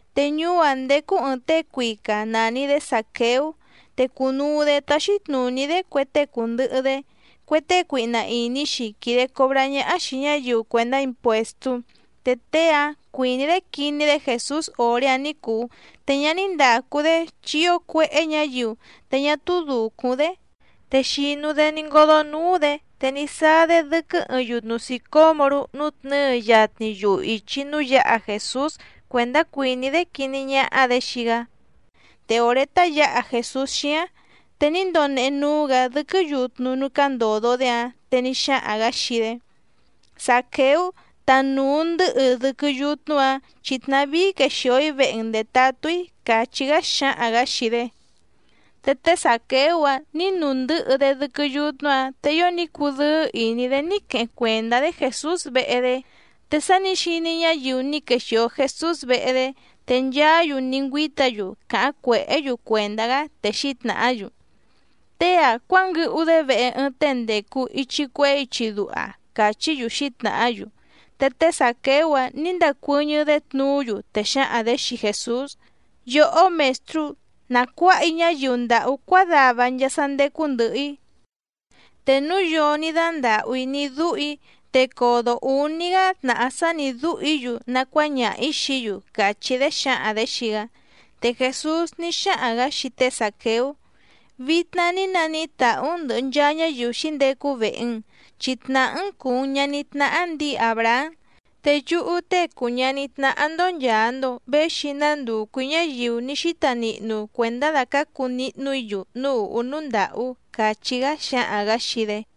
Te ñuú‑áⁿ ndécú ɨ̀ɨⁿ tée cuica nàni‑dé Zàqueú, te cùnuu‑dé táxí tnùní‑dé cue tée cùndɨhɨ‑dé, cue tée cuihna ìní‑xi quìde cobrá ñáhá xìi ñáyiu cuèndá impuèstú. Te tée‑áⁿ cuìní‑dé quiní‑dé Jèsús òré‑áⁿ ní cùu te ñá ní ndàcu‑dé, chi ío cuéhé ñǎyiu, te ñá túú dùcúⁿ‑dé. Te xìnu‑dé ní ngódó núú‑dě te ní sáá‑dé dɨ́quɨ́ ɨɨⁿ yutnu sìcómorú nùtnɨ́ɨ yatni yuhu ìchi núú yǎha Jèsús cuèndá cuìní‑dé quiní ñáhá‑dě xii‑gá. Te òré tá yǎha Jèsús xíáⁿ, te ní ndonehe núú‑gǎ dɨ́quɨ́ yutnu núú cándòdo‑dé‑áⁿ, te ní xáhaⁿ‑gǎ xii‑dé: —Zàqueú, tanùu ndɨ́hɨ dɨ́quɨ́ yutnu‑áⁿ, chi tnavíí quexìo‑í vehe‑n ndètatú‑í —càchí‑gá xáhaⁿ‑gǎ xii‑dé. Te té Zàqueú‑áⁿ nǐ nuu ndɨ̌hɨ‑dé dɨ́quɨ́ yutnu‑áⁿ, te ío ní cudɨ́ɨ́ ìní‑dé ní queheⁿ cuèndá‑dé Jèsús vehe‑dé. Te sá nǐ xiní ñáyiu ní quexìo Jesús vehe‑dé, te nchaá‑yu ní ngüíta‑yu càháⁿ cuèhé‑yu cuèndá‑gá, te xǐtnàhá‑yu: —Tée‑a cuánguɨhu‑dé vehe ɨɨⁿ tée ndècu ichi cuehé ichi duha —càchí‑yu xǐtnàhá‑yu. Te té Zàqueú‑áⁿ nǐ ndacuɨ́ñɨ́‑dé tnuú‑yu, te xǎhaⁿ‑dě xii Jèsús: —Yòhó Mèstrú, na cuǎha‑í ñáyiu ndàhú cuádava nchaa sá ndécú ndɨ̀hɨ‑í. Te núu yoo ní dándàhú‑í ní dúhù‑í, te codo ǔní‑gá tnàhá sá nǐ dúhù‑í‑yu nacuáñaha‑ǐ xií‑yu —càchí‑dé xǎhaⁿ‑dě xii‑gá. Te Jèsús ní xáhaⁿ‑gǎ xii té Zàqueú: —Vitna ní naníhí tàhú‑n ndɨ̀hɨ nchaa ñáyiu xǐndecu vehe‑n, chi tnàhá‑n cùu‑n ñaní tnáhá ndǐi Àbrahám. Te yúhú Tée cùu ñaní tnáhá‑ndó nchàa‑ndo véxi‑í nándùcu‑í ñáyiu ní xíta nihnu cuèndá dàcácu nihnu‑í‑yu núú ùhú núú ndàhú —càchí‑gá xáhaⁿ‑gǎ xii‑dé.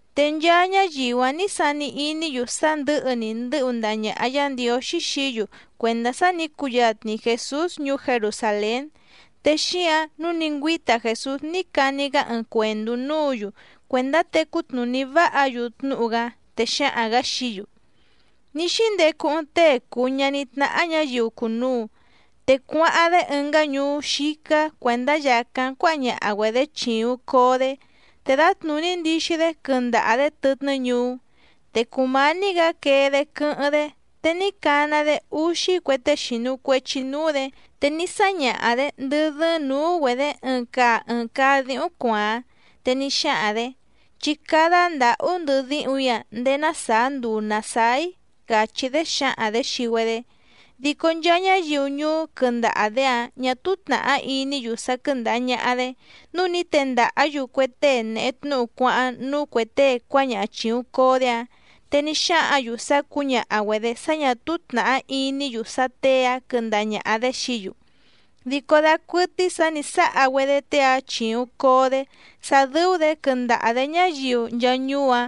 Te nchaa ñáyiu‑áⁿ nǐ sani iní‑yu sá ndɨ̌hɨ‑ni ndɨ́hu ndaha ñàha Yá Ndiǒxí xií‑yu cuèndá sá nǐ cuyatni Jèsús ñuú Jerusàlén, te xíǎⁿ nǔu ní ngüíta Jèsús ní cani‑gá ɨɨⁿ cuèndú núǔ‑yu cuèndá tecú tnùní váha‑yu tnúhu‑gá. Te xáhaⁿ‑gǎ xií‑yu: —Ní xíndecu ɨɨⁿ tée cùu ñaní tnáhá ñǎyiu cùnuu, te cuáháⁿ‑dé ɨngá ñuú xícá cuèndá yàcáⁿ cuáha ñaha‑güedě chìuⁿ coo‑dé, te dǎtnùní ndixi‑dé quɨndaha‑dě tɨtnɨ́ ñuú. Te cùmání‑gǎ quee‑dé quɨ́hɨ́ⁿ‑dé, te ní cana‑dé úxí cue tée xìnu cuechi núú‑dě, te ní sáñaha‑dě ndɨ́ dɨ́ɨ́ⁿ nǔú‑güedě ɨɨⁿ caa ɨɨⁿ caa díhúⁿ cuàáⁿ, te ní xáhaⁿ‑dě: “Chí cádá ndǎhú ndɨhɨ díhúⁿ‑ǎⁿ ndèé ná sàá nduu nàsáá‑í”, càchí‑dé xǎhaⁿ‑dě xii‑güedé. Dico nchaa ñáyiu ñuú quɨndaha‑dě‑áⁿ ñà túú tnàhá iní‑yu sá quɨ́ndàha ñaha‑dé, núu ní tendàhá‑yu cue tée nèhe tnúhu cuáháⁿ núú cuè tée cuáñaha chìuⁿ coo‑dé‑áⁿ, te ní xáhǎⁿ‑yu sá cǔñaha‑güedě sá ñà túú tnàhá iní‑yu sá těe‑áⁿ quɨndaha ñàha‑dé xií‑yu. Dico dacuɨtɨ́í sǎ nǐ sáha‑güedé tée‑áⁿ chìuⁿ coo‑dé sá dɨ́ú‑dě quɨndaha‑dě ñáyiu nchaa ñuú‑áⁿ,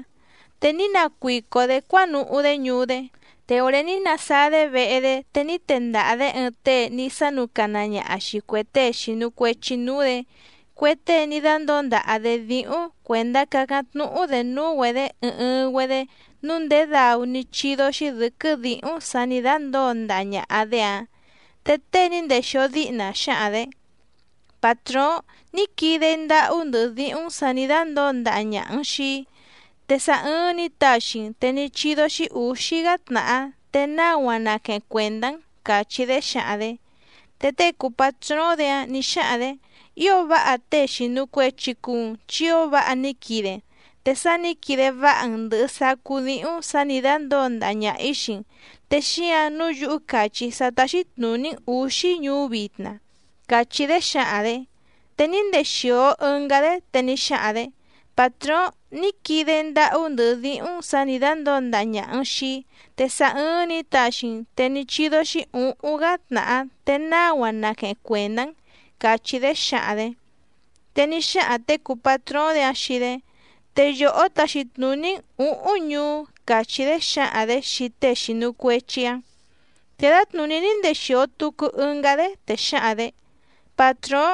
te ní nacuico‑dě cuánuhú‑dé ñuú‑dé. Te òré ní nasáá‑dé vehe‑dé, te ní tendaha‑dě ɨɨⁿ tée ní sánúcana ñaha xìi cue tée xìnu cuechi núú‑dě, cue tée ní dándǒo ndaha‑dě díhúⁿ cuèndá cácáⁿ tnúhú‑dě núú‑güedě ɨɨⁿ ɨɨⁿ‑güedé nǔu ndèé dau ní chídó‑xí dɨ̌quɨ́ dǐhúⁿ sǎ nǐ dándǒo ndaha ñàha‑dé‑áⁿ. Te tée ní ndèxio díhna xǎhaⁿ‑dě: “Pàtróóⁿ, ní quide‑í ndáhú ndɨhɨ díhúⁿ‑n sǎ nǐ dándǒo ndaha ñàha‑n xii‑í, te sá ɨ́ɨ́ⁿ nǐ taxi‑n te ní chídó‑xí ǔxí‑gá tnàhá te náu‑a naqueheⁿ cuèndá‑n”, càchí‑dé xǎhaⁿ‑dě. Te tée cùu patróóⁿ‑dě‑áⁿ nǐ xáhaⁿ‑dě: “Ío váha tée xìnu cuechi cuu‑n chi ío váha ní quide‑n, te sá nǐ quide váha‑n ndɨ̀hɨ sacú díhúⁿ sǎ nǐ dándǒo ndaha ñaha‑ǐ xii‑n, te xíǎⁿ nǔu yúhú càchí‑í sá táxí tnùní‑n ǔxí ñuú vitna”, càchí‑dé xǎhaⁿ‑dě. Te ní ndexìo ɨngá‑dé, te ní xáhaⁿ‑dě: “Pàtróóⁿ, ní quide‑í ndáhú ndɨhɨ díhúⁿ‑n sǎ nǐ dándǒo ndaha ñàha‑n xii‑í, te sá ɨ́ɨ́ⁿ nǐ taxi‑n te ní chídó‑xí ǔhúⁿ‑gá tnàhá te náu‑a naqueheⁿ cuèndá‑n”, càchí‑dé xǎhaⁿ‑dě. Te ní xáhaⁿ těe cùu patróóⁿ‑dě‑áⁿ xii‑dé: “Te yòhó taxi tnùní‑n ǔhúⁿ ñuú”, càchí‑dé xǎhaⁿ‑dě xii tée xìnu cuechi‑áⁿ. Te dǎtnùní ní ndexìo tucu ɨngá‑dé, te xǎhaⁿ‑dě: “Pàtróóⁿ,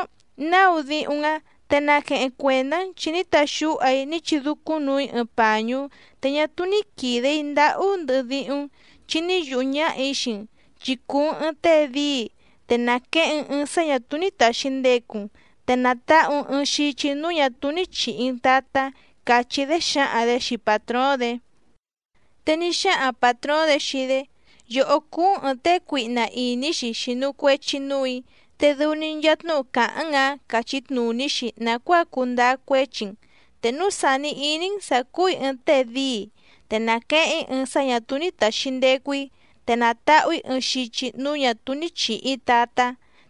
náu díhúⁿ‑n‑á, te naqueheⁿ cuèndá‑n chi ní taxúha‑í ní chidúcúⁿnuu‑í ɨɨⁿ pàñú te ñá túú ní quìde‑í ndáhú ndɨhɨ díhúⁿ‑n, chi ní yùhú ñáhà‑í xii‑n, chi cùu‑n ɨɨⁿ tée díi, te nàqueheⁿ‑n ɨɨⁿ sá ñà túú ní tàxi ndecu‑n, te nàtahu‑n ɨɨⁿ xichi núú ñà túú ní chìhi‑n tatá”, càchí‑dé xǎhaⁿ‑dě xii pàtróóⁿ‑dě. Te ní xáhaⁿ pàtróóⁿ‑dě xii‑dé: “Yòhó cúú‑n ɨ̀ɨⁿ tée cuihna ìní‑xi xìnu cuechi núù‑í, te dɨu‑ni nchaa tnúhu càháⁿ‑n‑ǎⁿ càchí tnùní‑xi nàcuáa cuu ndáá cuéchi‑n. Te núu sàni iní‑n sǎ cúù‑í ɨɨⁿ tée díi, te nàqueheⁿ‑í ɨɨⁿ sá ñà túú ní tàxi ndecu‑í, te nàtahu‑í ɨɨⁿ xichi núú ñà túú nǐ chihi‑í tatá,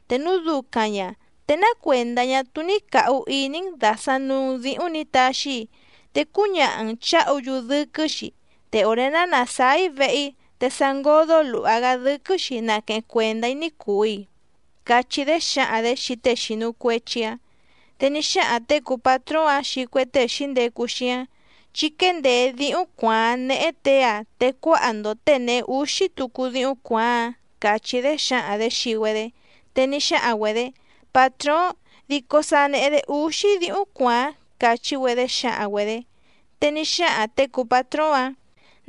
te núu ducaⁿ ña, ¿te ná cuèndá ñá túú ní càhu iní‑n dàsaⁿ nuu‑n díhúⁿ nǐ taxi‑í, te cúñaha‑n chǎhu‑yu dɨ́quɨ́‑xi, te òré ná nàsáá‑í vehe‑í, te sa ngódó lùha‑gá dɨ́quɨ́‑xi naqueheⁿ cuèndá‑í ní cùu‑i?”, cachí‑dé xǎhaⁿ‑dě xii tée xìnu cuechi‑áⁿ. Te ní xáhaⁿ těe cùu patróóⁿ‑áⁿ xii cue tée xǐndecu xíáⁿ: “Chí quéndèé díhúⁿ cuàáⁿ néhé těe‑a, te cuáha‑ndo těe nèhe úxí tucu díhúⁿ cuàáⁿ‑áⁿ”, càchí‑dé xǎhaⁿ‑dě xii‑güedé. Te ní xáhaⁿ‑güedě: “Pàtróóⁿ, dico sa nèhe‑dé úxí díhúⁿ cuàáⁿ”, càchí‑güedé xǎhaⁿ‑güedě. Te ní xáhaⁿ těe cùu patróóⁿ‑áⁿ: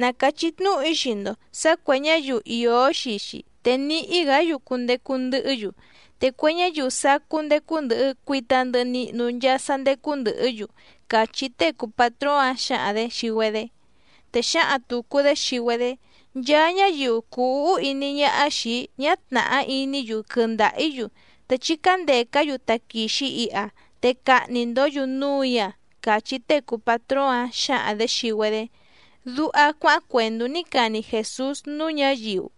“Na càchí tnúhu‑í xii‑ndo sǎ cuè ñáyiu ìó xii‑xi te níhí‑gǎ‑yu cundecu ndɨhɨ́‑yu, te cue ñáyiu sacú ndécú ndɨ̀hɨ cuita ndɨhɨ nihnu nchaa sá ndécú ndɨ̀hɨ́‑yu”, càchí tée cùu patróóⁿ‑áⁿ xǎhaⁿ‑dě xii‑güedé. Te xǎhaⁿ tùcu‑dé xii‑güedé: “Nchaa ñáyiu cùu úhú iní ñáhá xìi‑í ñá tnàhá iní‑yu quɨndaha‑ǐ‑yu, te chí cándècá‑yu taquìxi iha, te cahni‑ndǒ‑yu núù‑í‑a”, càchí tée cùu patróóⁿ‑áⁿ xǎhaⁿ‑dě xii‑güedé —duha cuáháⁿ cuèndú ní cani Jèsús núú ñǎyiu.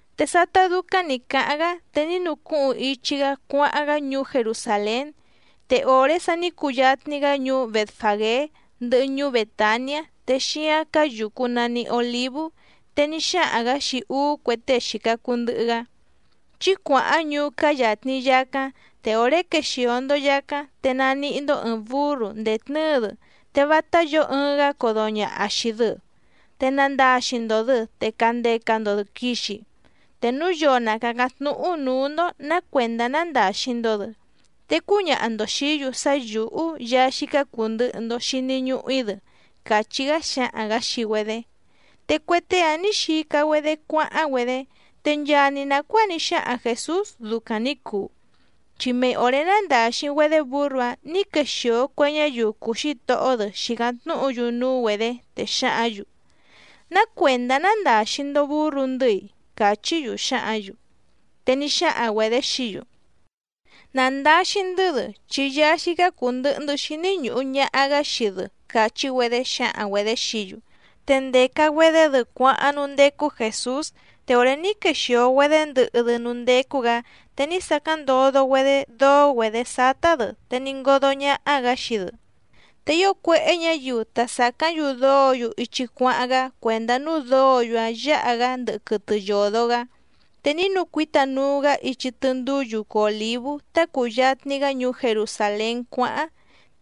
Te sátá dúcáⁿ nǐ cáháⁿ‑gá, te ní nucúhuⁿ ichi‑gá cuáháⁿ‑gá ñuú Jerusàlén. Te òré sa ní cuyatni‑gá ñuú Bètfagé, ndɨhɨ ñuú Bètaniá te xíáⁿ cáá yùcu nani Olívú, te ní xáhaⁿ‑gǎ xii úú cue tée xìca cuu ndɨhɨ‑gá: —Chí cuàháⁿ ñuú cáá yàtni yacáⁿ, te òré quexìo‑ndo yacáⁿ, te naníhí‑ndó ɨ̀ɨⁿ búrru ndètnɨ́ɨ‑dɨ, te vátá yǒo ɨɨⁿ‑gá codo ñàha xii‑dɨ, te nandaxi‑ndo‑dɨ te candeca‑ndo‑dɨ quìxi. Te núu yoo na càcáⁿ tnúhu núú‑ndó nǎ cuèndá nándàxi‑ndo‑dɨ, te cúñaha‑ndo xìí‑yu sá yǔhú Yaá xícá cùu ndɨhɨ‑ndo xini ñuhu‑í‑dɨ —càchí‑gá xáhaⁿ‑gǎ xii‑güedé. Te cue tée‑áⁿ nǐ xica‑güedé cuáháⁿ‑güedé, te nchaa‑ni nàcuáa ní xáhaⁿ Jèsús ducaⁿ nǐ cuu, chi mei òré nándàxi‑güedé bǔrru‑áⁿ nǐ quexìo cue ñáyiu cùu xítohó‑dɨ xìcáⁿ tnúhu‑yu núú‑güedě, te xǎhǎⁿ‑yu: —¿Ná cuèndá nándàxi‑ndo búrru‑ndɨ́‑i? —càchí‑yu xǎhǎⁿ‑yu. Te ní xáhaⁿ‑güedě xií‑yu: —Nà ndaxi‑ndɨ́‑dɨ chi Yaá xícá cùu ndɨhɨ‑ndɨ́ xíní ñùhu ñaha‑gá xii‑dɨ —càchí‑güedé xǎhaⁿ‑güedě xií‑yu. Te ndèca‑güedé‑dɨ cuáháⁿ núú ndécú Jèsús, te òré ní quexìo‑güedé ndɨhɨ‑dɨ núú ndécú‑gǎ te ní sacáⁿ ndodo‑güedé dóó‑güedě sátá‑dɨ, te ní ngódó ñáhá‑gǎ xii‑dɨ. Te ío cuéhé ñǎyiu ta sàcáⁿ‑yu dóǒ‑yu ichi cuáháⁿ‑gá cuèndá núú dǒǒ‑yu‑áⁿ yǎha‑gá ndɨhɨ quɨtɨ yòdo‑gá. Te ní nucuíta nuu‑gá ichi tɨndúú yucu Òlívú tá cùyatni‑gá ñuú Jerusàlén cuáháⁿ,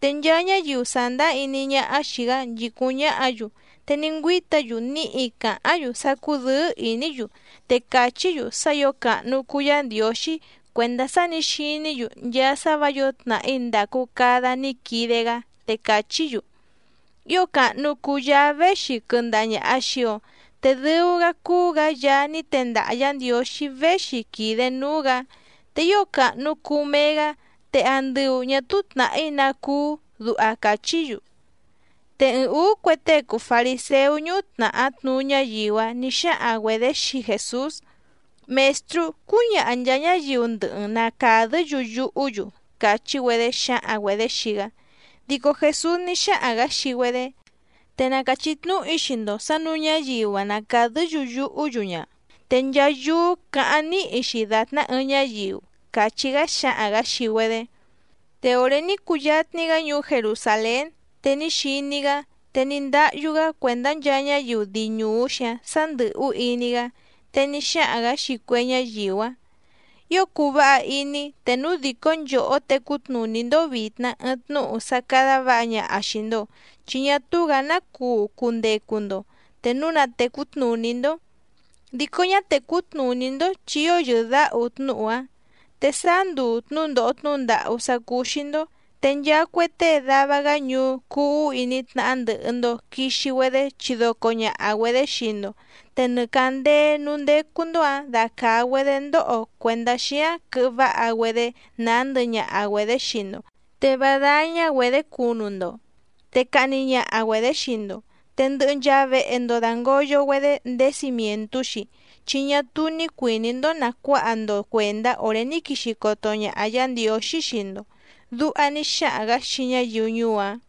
te nchaa ñáyiu sàndáá iní ñáhá xìi‑gá nchìcúⁿ ñáhǎ‑yu te ní ngüíta‑yu níhi càháⁿ‑yu sá cúdɨ̌ɨ́ ìní‑yu, te càchí‑yu sá ǐo càhnu cuu Yá Ndiǒxí cuèndá sá nǐ xiní‑yu nchaa sá vǎ yǒo tnàhí ndàcu cada ní quide‑gá. Te càchí‑yu: —¡Ío càhnu cuu Yaá véxi quɨndaha ñàha xii‑o, te dɨu‑gá cúú‑gǎ Yaá ní tendaha Yǎ Ndiǒxí véxi quìde núú‑gǎ! ¡Te ío càhnu cuu mee‑gá! ¡Te andɨu ñà túú tnàhí ná cúú! —duha càchí‑yu. Te ɨɨⁿ ǔú cue tée cùu fariséú ñúhú tnàhá tnuú ñáyiu‑áⁿ nǐ xáhaⁿ‑güedě xii Jèsús: —Mèstrú, cúñaha nchàa ñáyiu ndɨhɨ‑n na càdɨ́‑yu yuhú‑yu —càchí‑güedé xǎhaⁿ‑güedě xii‑gá. Dico Jèsús ní xáhaⁿ‑gǎ xii‑güedé: —Te na càchí tnúhu‑í xii‑ndo sǎ nǔu ñáyiu‑a na càdɨ́‑yu yuhú‑yu ña, te nchaa yúú cǎháⁿ níhi‑xi dàtná ɨɨⁿ ñáyiu —càchí‑gá xáhaⁿ‑gǎ xii‑güedé. Te òré ní cuyatni‑gá ñuú Jerusàlén te ní xiní‑gá, te ní ndáhyú‑gá cuèndá nchaa ñáyiu dii ñùú‑xi‑áⁿ sǎ ndɨ̀hú iní‑gá. Te ní xáhaⁿ‑gǎ xii cue ñáyiu‑áⁿ: —Ío cuu váha iní‑í te núu dìcó nchòhó tecú tnùní‑ndó vìtna ɨɨⁿ tnúhu sá cádá vǎha ñaha xìi‑ndo, chi ñá túú‑gǎ ná cuu cundecu‑ndo, te núu na tècú tnùní‑ndó. Dico ñá tècú tnùní‑ndó, chi ío yɨ̀dáhu tnúhu‑a. Te sáá nduu tnǔndòho tnúhu ndàhú sá cúú‑xí‑ndó, te nchaa cue tée dava‑gá ñuú cúú ǔhú iní tnáhá ndɨ̀hɨ‑ndo quixi‑güedé chidoco ñàha‑güedé xii‑ndo, te nɨ càndéé núú ndécú‑ndó‑ǎⁿ dacàa‑güedé ndóho cuèndá xíáⁿ quɨhɨ váha‑güedé nàá ndɨhɨ ñaha‑güedě xii‑ndo, te vá dáñá‑güedě cunu‑ndo. Te cahni ñaha‑güedě xii‑ndo, te ndɨhɨ nchaa vehe‑ndo dàngoyo‑güedé ndéé cimièntú‑xi, chi ñá túú ní cuìní‑ndó nàcuáha‑ndo cuèndá òré ní quixi coto ñaha Yǎ Ndiǒxí xii‑ndo —duha ní xáhaⁿ‑gǎ xii ñáyiu ñuú‑áⁿ.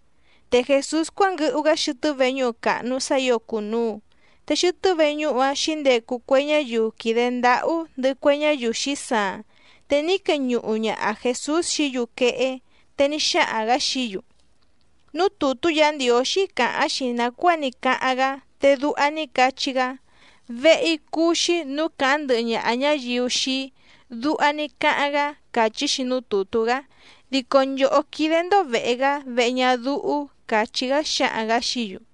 Te Jèsús cuánguɨhu‑gá xɨtɨ́ veñúhu càhnu sá ǐo cùnuu, te xɨtɨ́ veñúhu‑áⁿ xǐndecu cue ñáyiu quìde ndáhú ndɨhɨ cue ñáyiu xǐsaaⁿ. Te ní queñuhu ñaha Jèsús xií‑yu quehé. Te ní xáhaⁿ‑gǎ xií‑yu: —Núú tùtú Yǎ Ndiǒxí càháⁿ‑xi nàcuáa ní cáháⁿ‑gá, te duha ní cachí‑gá: “Vehe‑í cúú‑xí nǔú càháⁿ ndɨhɨ ñaha ñáyiu xii‑í”, duha ní cáháⁿ‑gá càchí‑xi núú tùtú‑gá. Dico nchòhó quídé‑ndó vèhe‑gá vehe ñadúhú —càchí‑gá xáhaⁿ‑gǎ xií‑yu.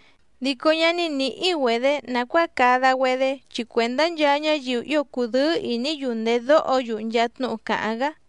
Dico ñá nìhí‑güedé nàcuáa cada‑güedé, chi cuèndá nchaa ñáyiu ío cùdɨ́ɨ́ ìní‑yu ndèdóho‑yu nchaa tnúhu càháⁿ‑gá.